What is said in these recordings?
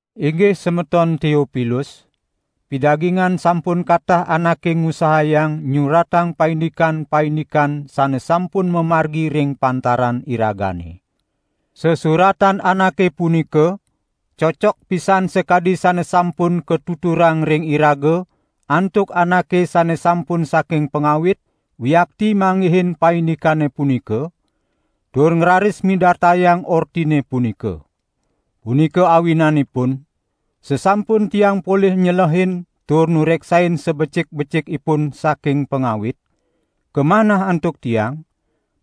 Inggih semeton Teopilus, pidagingan sampun katah anake ngusahayang nyuratang paindikan-paindikan sane sampun mamargi ring pantaran iragane. Sesuratan anake punika cocok pisan sakadi sane sampun katuturang ring iraga antuk anake sane sampun saking pangawit wiakti manggihin paindikane punika, tur ngraris midartayang ortine punika. Punika awinanipun, sasampun tiang polih nyelehin tur nureksain sabecik-becikipun saking pangawit, kamanah antuk tiang,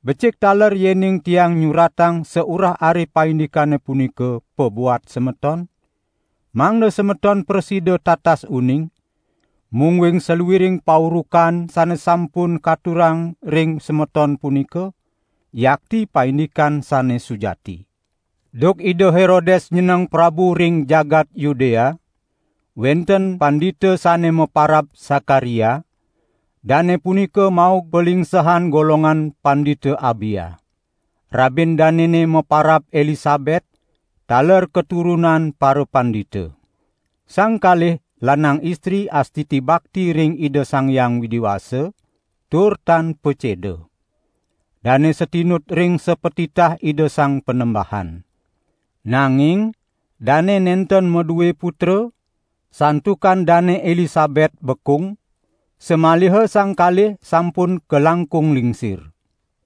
becik taler yening tiang nyuratang saurah-arih paindikane punika pabuat semeton, mangda semeton prasida tatas uning, mungguing saluiring paurukan sane sampun katurang ring semeton punika, yakti paindikan sane sujati. Duk Ida Herodes nyeneng prabu ring jagat Yudea, wenten pandita sane maparab Sakaria; dane punika maug palingsehan golongan Pandita Abia. Rabin danene maparab Elisabet, taler katurunan parapandita. Sang kalih lanang istri astiti bakti ring Ida Sang Hyang Widi Wasa, tur tan paceda. Dane satinut ring sapatitah Ida Sang Panembahan. Nanging dane nenten madue putra, santukan Dane Elisabet bekung, samaliha sang kalih sampun kalangkung lingsir.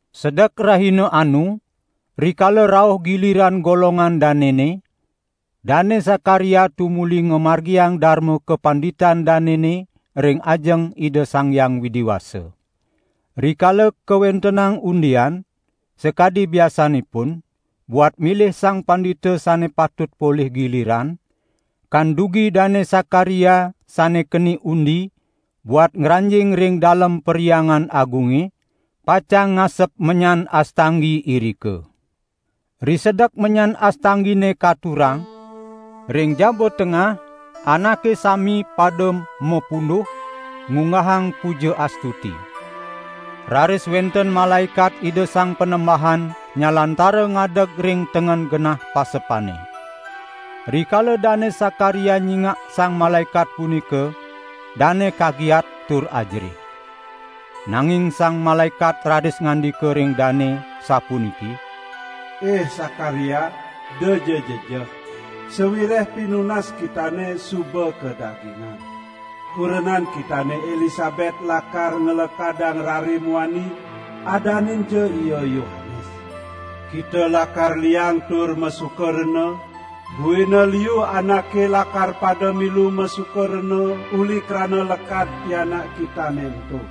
Sedek rahina anu, rikala rauh giliran golongan danene, Dane Sakaria tumuli ngamargiang darma kapanditan danene ring ajeng Ida Sang Hyang Widi Wasa. Rikala kawentenang undian, sakadi biasanipun, buat milih sang pandita sane patut polih giliran, kandugi Dane Sakaria sane keni undi buat ngranjing ring dalem Perhyangan Agunge, pacang ngasep menyan astanggi irika. Risedek menyan astanggine katurang, ring jaba tengah anake sami pada mapunduh ngunggahang puja astuti. Raris wenten malaekat Ida Sang Panembahan nyalantara ngadeg ring tengen genah pasepane. Rikala Dane Sakaria nyingak sang malaekat punika dane kagiat tur ajerih. Nanging sang malaekat raris ngandika ring dane, sapuniki: "Ih Sakaria, edaja jejeh, sawireh pinunas kitane suba kadagingan. Kurenan kitane Elisabet lakar nglekadang rare muani, adaninja ia Yohanes. Kita lakar liang tur masuka rena, buina liu anake lakar pada milu masuka rena uli krana lekad pianak kitane ento.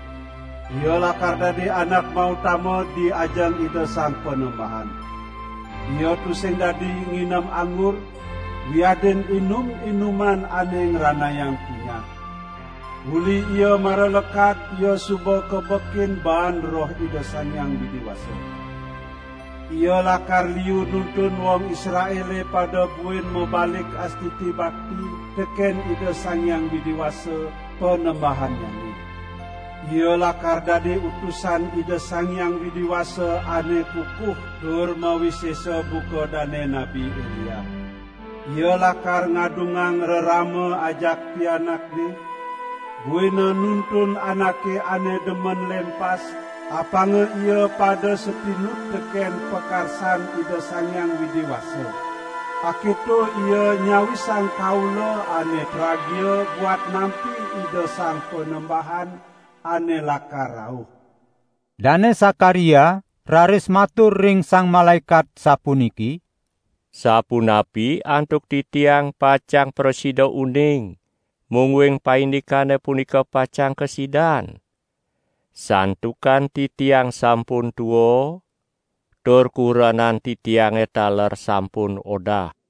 Ia lakar dadi anak mautama di ajeng Ida Sang Panembahan. Ia tusing dadi nginem anggur wiadin inum-inuman ane ngranayang punyah. Uli ia mara lekad ia suba kabekin baan Roh Ida Sang Hyang Widi Wasa. Ia lakar liu nuntun wong Israele pada buin mabalik astiti bakti teken Ida Sang Hyang Widi Wasa, Panembahannyane. Ia lakar dadi utusan Ida Sang Hyang Widi Wasa ane kukuh tur mawisesa buka dane Nabi Elia. Ia lakar ngadungang rerama ajak pianakne; buina nuntun anake ane demen lempas, apanga ia pada satinut teken pakarsan Ida Sang Hyang Widi Wasa. Aketo ia nyawisang kaula ane tragia buat nampi Ida Sang Panembahan ane lakar rauh." Dane Sakaria raris matur ring sang malaekat sapuniki: "Sapunapi antuk titiang pacang prasida uning mungguing paindikane punika pacang kasidan? Santukan titiang sampun tua tur kurenan titiange taler sampun odah."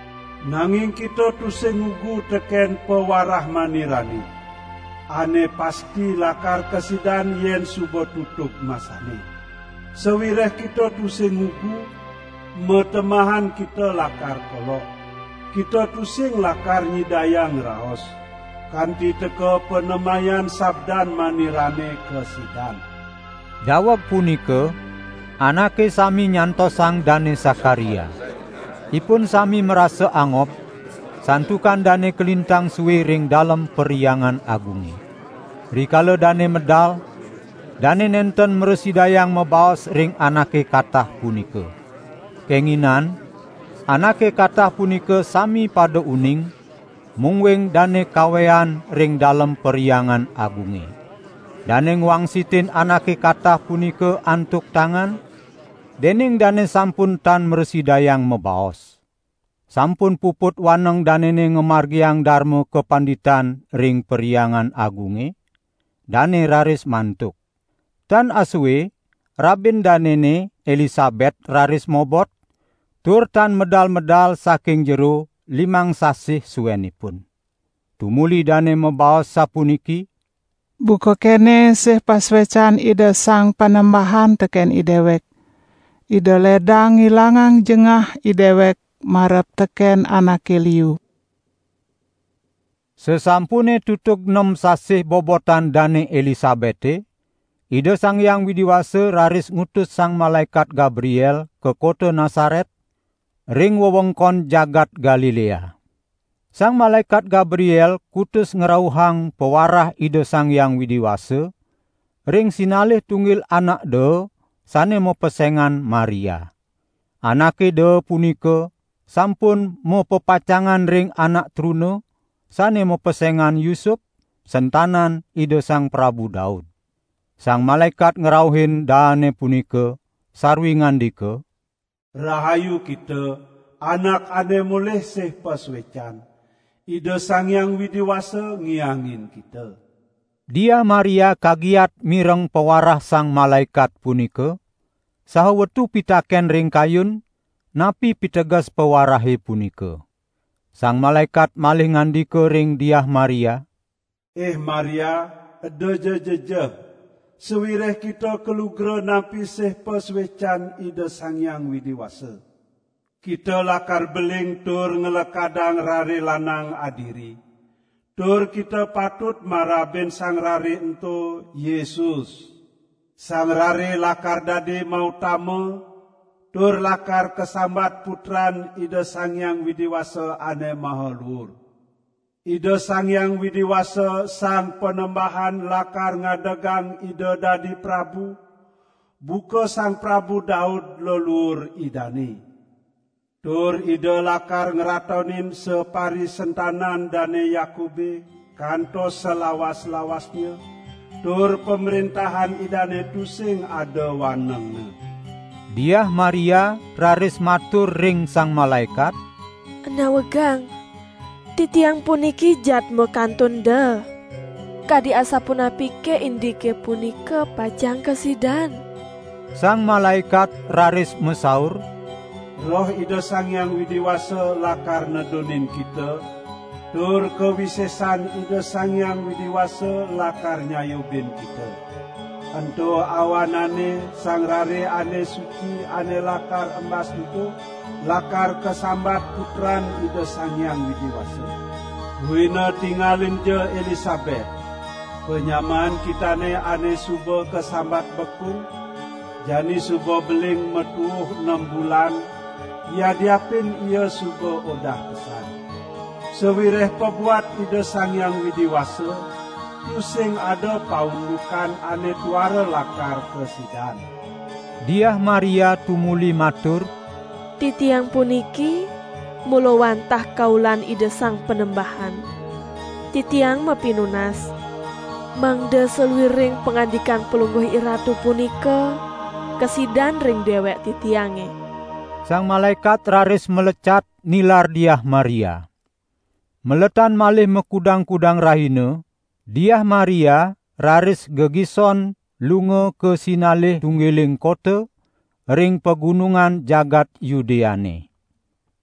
Nanging kita tusing ngugu teken pawarah manirane, ane pasti lakar kasidan yen suba tutug masanne. Sawireh kita tusing ngugu, matemahan kita lakar kolok. Kita tusing lakar nyidayang ngraos, kanti teka panemayan sabdan manirane kasidan." Daweg punika anake sami nyantosang Dane Sakaria. Ipun sami marasa angob santukan dane kalintang sue ring dalem Perhyangan Agunge. Rikala dane medal, dane nenten mrasidayang mabaos ring anake katah punika. Kenginan anake katah punika sami pada uning, mungguing dane kawean ring dalem Perhyangan Agunge. Dane ngwangsitin anake katah punika antuk tangan, dening dane sampun tan mrasidayang mabaos. Sampun puput waneng danene ngamargiang darma kapanditan ring Perhyangan Agunge, dane raris mantuk. Tan asue rabin danene Elisabet raris mobot, tur tan medal-medal saking jero limang sasih suenipun. Tumuli dane mabaos sapuniki: "Buka kene sih pasuecan Ida Sang Panembahan teken idewek, Ida ledang ngilangang jengah idewek marep teken anake liu." Sasampune tutug nem sasih bobotan Dane Elisabete, Ida Sang Hyang Widi Wasa raris ngutus Sang Malaekat Gabriel ka kota Nasaret, ring wewengkon jagat Galilea. Sang Malaekat Gabriel kutus ngrauhang pawarah Ida Sang Hyang Widi Wasa, ring sinalih tunggil anak daa sane mapesengan Maria. Anake daa punika sampun mapepacangan ring anak truna, sane mapesengan Yusup, sentanan Ida Sang Prabu Daud. Sang malaekat ngrauhin daane punika, sarwi ngandika: "Rahayu kita, anak ane molih sih pasuecan, Ida Sang Hyang Widi Wasa ngiangin kita!" Diah Maria kagiat mireng pawarah sang malaekat punika, saha wetu pitaken ring kayun, napi piteges pawarahe punika. Sang malaekat malih ngandika ring Diah Maria: "Ih Maria, edaja jejeh, sawireh kita kalugra nampi sih pasuecan Ida Sang Hyang Widi Wasa. Kita lakar beling tur nglekadang Rare lanang adiri, tur kita patut marabin Sang Rare ento: Yesus. Sang Rare lakar dadi mautama tur lakar kasambat Putran Ida Sang Hyang Widi Wasa Ane Maha Luur. Ida Sang Hyang Widi Wasa Sang Panembahan lakar ngadegang Ida dadi prabu, buka Sang Prabu Daud leluur Idane. Tur Ida lakar ngratonin saparisentanan Dane Yakube kantos salawas-lawasnya, tur pamrentahan Idane tusing ada wanengne." Diah Maria raris matur ring sang malaekat: "Nawegang, titiang puniki jadma kantun daa. Kadi asapunapike indike punika pacang kasidan?" Sang malaekat raris masaur: "Roh Ida Sang Hyang Widi Wasa lakar nedunin kita, tur kawisesan Ida Sang Hyang Widi Wasa lakar nyayubin kita. Ento awanane Sang Rare ane suci ane lakar embas ento, lakar kasambat Putran Ida Sang Hyang Widi Wasa. Buina tingalinja Elisabet, panyamaan kitane ane suba kasambat bekung, jani suba beling matuuh nem bulan, yadiapin ia suba odah pesan. Sawireh pabuat Ida Sang Hyang Widi Wasa, tusing ada paundukan ane tuara lakar kasidan." Diah Maria tumuli matur: "Titiang puniki mula wantah kaulan Ida Sang Panembahan, titiang mapinunas mangda saluiring pangandikan palungguh iratu punika kasidan ring dewek titiange." Sang malaekat raris malecat, nilar Diah Maria. Maletan malih makudang-kudang rahina, Diah Maria raris gegison lunga ka sinalih tunggiling kota ring pagunungan jagat Yudeane.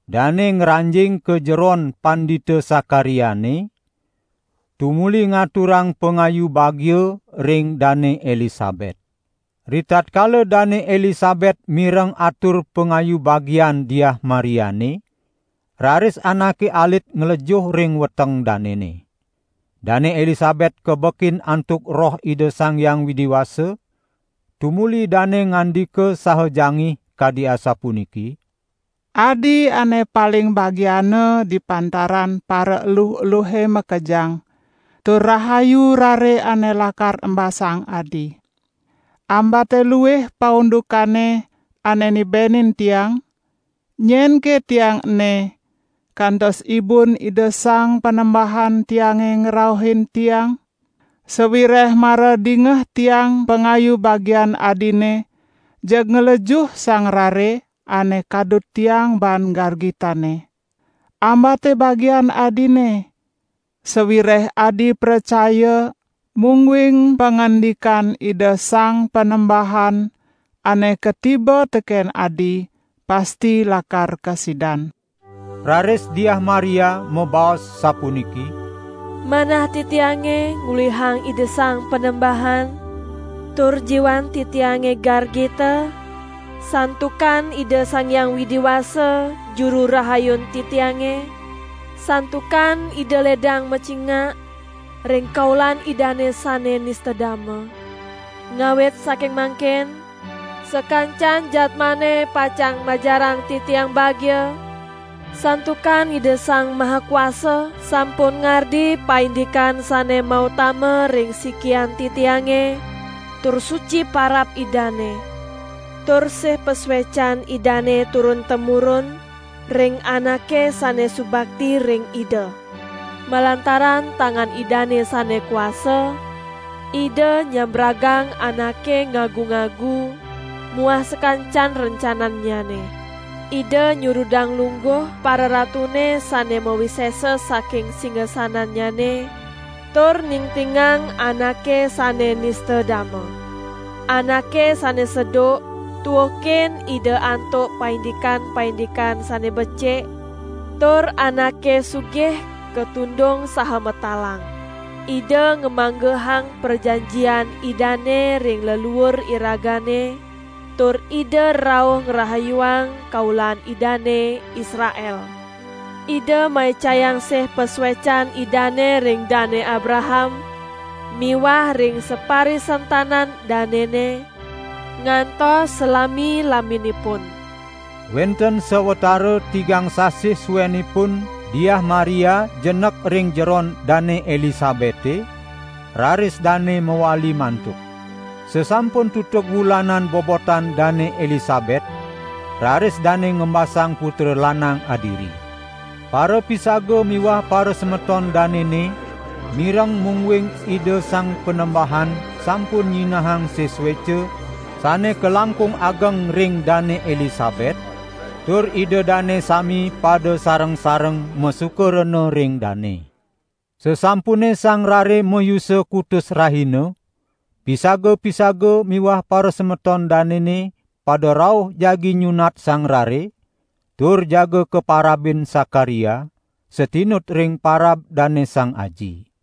Dane ngranjing ka jeron Pandita Sakariane, tumuli ngaturang pangayu bagia ring Dane Elisabet. Ritatkala Dane Elisabet mireng atur pangayu bagian Diah Mariane, raris anake alit nglejuh ring weteng danene. Dane Elisabet kabekin antuk Roh Ida Sang Hyang Widi Wasa, tumuli dane ngandika saha jangih kadi asapuniki: "Adi ane paling bagiana di pantaran paraeluh-eluhe makejang, tur rahayu Rare ane lakar embasang adi. Ambate luih paundukane ane nibenin tiang, nyenke tiang ene, kantos ibun Ida Sang Panembahan tiange ngrauhin tiang? Sawireh mara dingeh tiang pangayu bagian adine, jeg nglejuh sang rare ane kadut tiang baan gargitanne. Ambate bagian adine, sawireh adi pracaya, mungguing pangandikan Ida Sang Panembahan ane katiba teken adi, pasti lakar kasidan." Raris Diah Maria mabaos sapuniki: "Manah titiange ngluihang Ida Sang Panembahan, tur jiwan titiange gargita santukan Ida Sang Hyang Widi Wasa, Juru Rahayun titiange, santukan Ida ledang macingak ring kaulan Idane sane nista dama. Ngawit saking mangkin sakancan jadmane pacang majarang titiang bagia, santukan Ida Sang Maha Kuasa sampun ngardi paindikan sane mautama ring sikian titiange, tur suci parab Idane; tur sih pasuecan Idane turun-temurun ring anake sane subakti ring Ida. Malantaran tangan Idane sane kuasa, Ida nyambragang anake ngagu-ngagu, muah sakancan rencanannyane. Ida nyurudang lungguh pararatune sane mawisesa saking singasanannyane, tur ningtingang anake sane nista dama. Anake sane seduk tuukin Ida antuk paindikan-paindikan sane becik, tur anake sugih katundung saha matalang. Ida ngamanggehang prajanjian Idane ring leluur iragane, tur Ida rauh ngrahayuang kaulan Idane, Israel. Ida maicayang sih pasuecan Idane ring Dane Abraham miwah ring saparisentanan danene ngantos salami-laminipun." Wenten sawatara tigang sasih suenipun Diah Maria jenek ring jeron Dane Elisabete, raris dane mawali mantuk. Sasampun tutug wulanan bobotan Dane Elisabet, raris dane ngembasang putra lanang adiri. Parapisaga miwah parasemeton danene mireng mungguing Ida Sang Panembahan sampun nyinahang sih sueca sane kalangkung ageng ring Dane Elisabet, tur ida dane sami pada sareng-sareng masuka rena ring dane. Sasampune sang rare mayusa kutus rahina, pisaga-pisaga miwah parasemeton danene pada rauh jagi nyunat sang rare, tur jaga kaparabin Sakaria, satinut ring parab dane sang aji.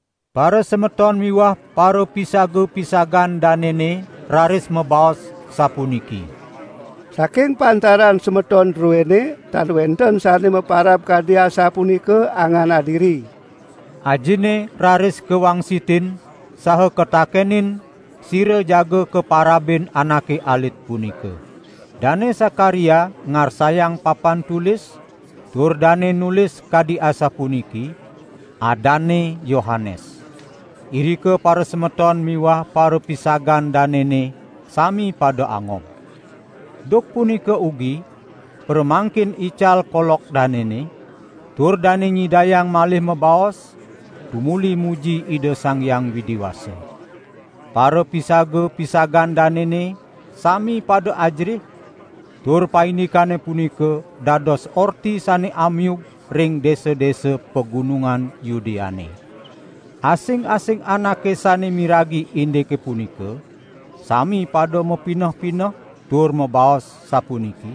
Parasemeton miwah parapisaga-pisagan danene raris mabaos sapuniki: "Saking pantaran semeton druene tan wenten sane maparab kadi asapunika angan adiri." Ajinne raris kawangsitin saha katakenin sira jaga kaparabin anake alit punika. Dane Sakaria ngarsayang papan tulis tur dane nulis kadi asapuniki: "Adanne Yohanes." Irika parasemeton miwah parapisagan danene sami pada angob. Duk punika ugi pramangkin ical kolok danene, tur dane nyidayang malih mabaos, tumuli muji Ida Sang Hyang Widi Wasa. Parapisaga-pisagan danene sami pada ajerih, tur paindikane punika dados orti sane amiug ring desa-desa pagunungan Yudeane. Asing-asing anake sane miragi indike punika, sami pada mapineh-pineh tur mabaos sapuniki: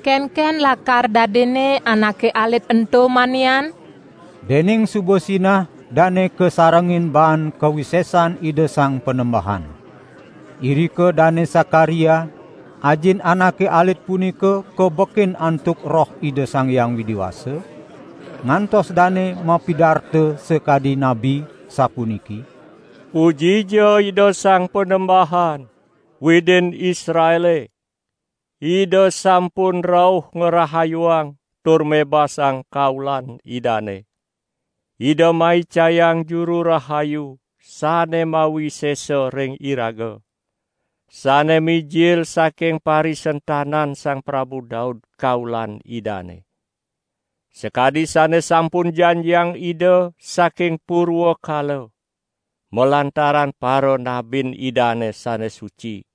"Kenken lakar dadinne anake alit ento manian?" Dening suba sinah dane kasarengin baan kawisesan Ida Sang Panembahan. Irika Dane Sakaria, ajin anake alit punika kabekin antuk Roh Ida Sang Hyang Widi Wasa, ngantos dane mapidarta sakadi nabi, sapuniki: "Pujija Ida Sang Panembahan, Widin Israele! Ida sampun rauh ngrahayuang tur mebasang kaulan Idane. Ida maicayang Juru Rahayu sane mawisesa ring iraga, sane mijil saking parisentanan Sang Prabu Daud, kaulan Idane. Sakadi sane sampun janjiang Ida saking purwakala malantaran paranabin Idane sane suci,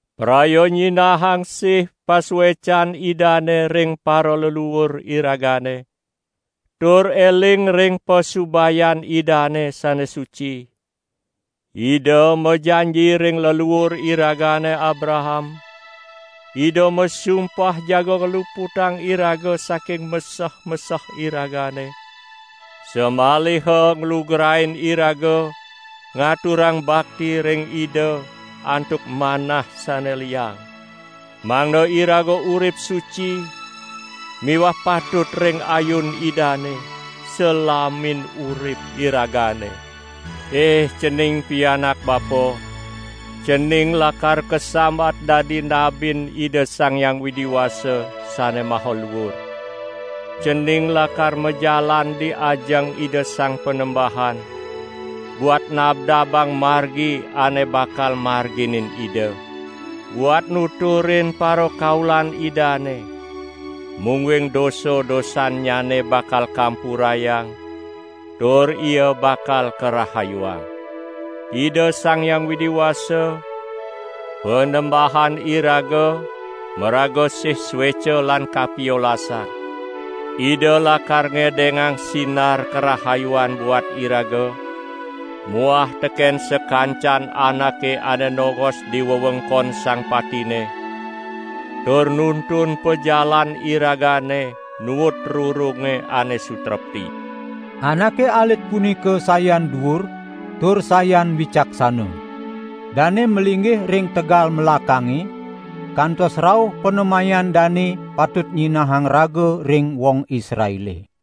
praya nyinahang sih pasuecan Idane ring paraleluur iragane, tur eling ring pasubayan Idane sane suci, Ida majanji ring leluur iragane Abraham, Ida masumpah jaga ngluputang iraga saking meseh-meseh iragane, samaliha nglugrain iraga ngaturang bakti ring Ida antuk manah sane liang. Mangda iraga urip suci miwah patut ring ayun Idane, salamin urip iragane. Ih cening pianak bapa, cening lakar kasambat dadi nabin Ida Sang Hyang Widi Wasa Sane Maha Luur. Cening lakar majalan di ajeng Ida Sang Panembahan buat nabdabang margi ane bakal marginin Ida; buat nuturin parakaulan Idane, mungguing dosa-dosannyane bakal kampurayang, tur ia bakal karahayuang. Ida Sang Hyang Widi Wasa, Panembahan iraga maraga sih sueca lan kapiolasan. Ida lakar ngedengang sinar karahayuan buat iraga, muah teken sakancan anake ane nongos di wewengkon sang patine, tur nuntun pajalan iragane nuut rurunge ane sutrepti." Anake alit punika sayan duur tur sayan wicaksana. Dane malinggih ring tegal melakange kantos rauh panemayan dane patut nyinahang raga ring wong Israele.